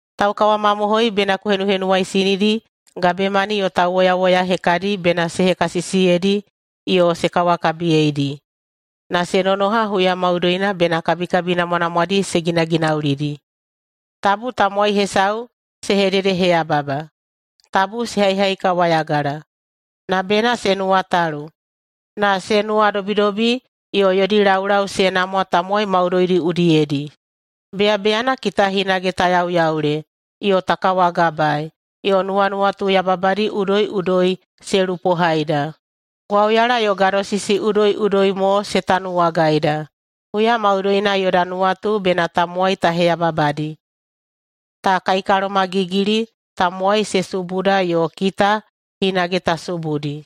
Taukawamamohoi bena ku henuhenuwaisinidi gabemani yo tauwoyawoya hekadi bena se hekasisiyeidi yo se kawakabiyeidi, na se nonoha huya maudoina bena kabikabi namwanamwadi se ginaginaulidi. Tabu tamowai hesau se hededeheyababa. Tabu se haihaikawayagala. Na bena se nuwatalu, na se nuwadobidobi yo yodi laulau se namwa tamowai maudoidi udiyedi. Beyabeyana kita hinage ta yauyaule yo ta kawagabae, yo nuwanuwatu yababadi udoiꞌudoi se lupohaida. Gwauyala yo gadosisi udoiꞌudoi mo se tanuwagaida. Huya maudoina yoda nuwatu bena tamowai ta heyababadi. Ta kaikalomagigili. Tamowai se subuda yo kita hinage ta subudi.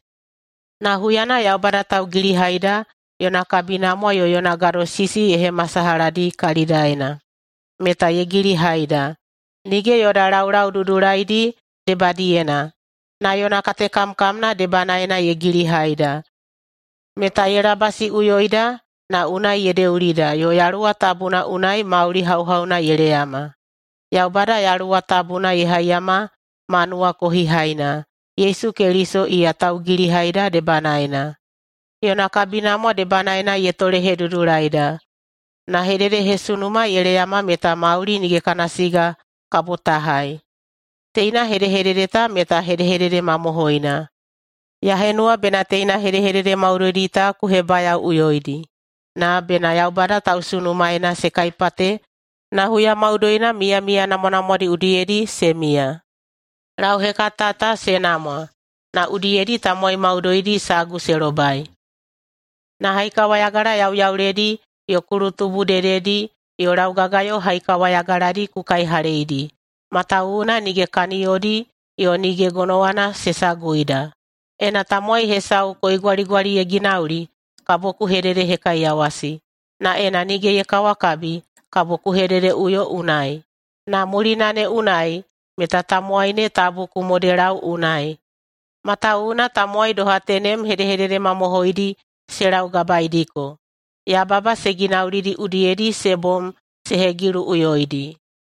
Na huyana Yaubada Taugilihaida yona kabinamwa yo yona gadosisi ye hemasalahadi kalidaena, meta ye gilihaida. Nige yoda laulau dudulaidi debadiyena, na yona katekamkamna debanaena ye gilihaida, meta ye labasiꞌuyoida na unai ye deulida, yo Yaluwa Tabuna unai mauli hauhauna ye leyama. Yaubada Yaluwa Tabuna ye haiyama ma nuwakohihaina, Yesu Keliso iya taugilihaida debanaena. Yona kabinamwa debanaena ye tolehedudulaida, na hededehesunuma ye leyama meta mauli nige kana siga kabo ta hai. Teina hedehedede ta meta hedehedede mamohoina. Ya henuwa bena teina hedehedede maudoidi ta ku hebayaoꞌuyoidi, na bena Yaubada tausunumaena se kaipate na huya maudoina miyamiya namwanamwadi udiyedi se miya. Lauhekata ta se namwa na udiyedi tamowai maudoidi sagu se lobai. Na haikawayagala yauyauledi yo kulutubu dededi yo laugagayo haikawayagaladi ku kaihaleidi, matawuwuna nige kaniyodi yo nige gonowana se saguida. Ena tamowai hesau koigwaligwali ye ginauli, kabo ku hededehekaiyawasi. Na ena nige ye kawakabi, kabo ku hededeꞌuyo unai. Na mulina ne unai meta tamowai ne tabu ku modelau unai, matawuwuna tamowai doha tenem hedehedede mamohoidi se laugabaeidiko. Yababa se ginaulidi udiyedi se bom se hegiluꞌuyoidi.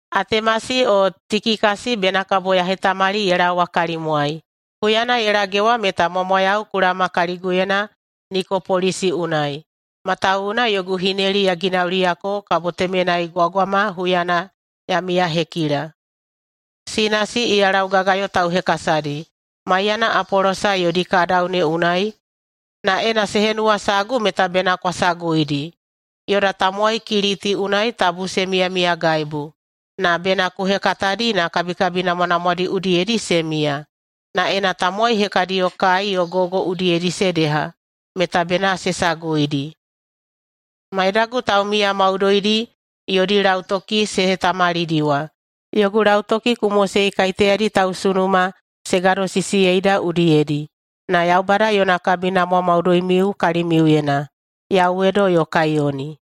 Atemasi o Tikikasi bena kabo ya hetamali ye laowa kalimwai. Huyana ye lagewa meta mwamwayau ku laoma kaliguyena Nikopolisi unai, matawuwuna yogu hineli ya ginauliyako kabo temenai gwagwama huyana ya miyahekila. Sinasi, iya laugagayo tauhekasadi, maiyana Apolosa yodi kadau ne unai, na ena se henuwasagu meta bena kwa saguidi. Yoda tamowai Kiliti unai tabu se miyamiyagaibu, na bena ku hekatadi na kabikabi namwanamwadi udiyedi se miya, na ena tamowai hekadiyo kai yo gogo udiyedi se deha, meta bena se saguidi. Maidagu taumiya maudoidi yodi lautoki se hetamalidiwa. Yogu lautoki ku mosei kaiteyadi tausunuma se gadosisiyeida udiyedi. Na Yaubada yona kabinamwa maudoimiu kalimiuyena! [Yauwedo yo kaiyoni.]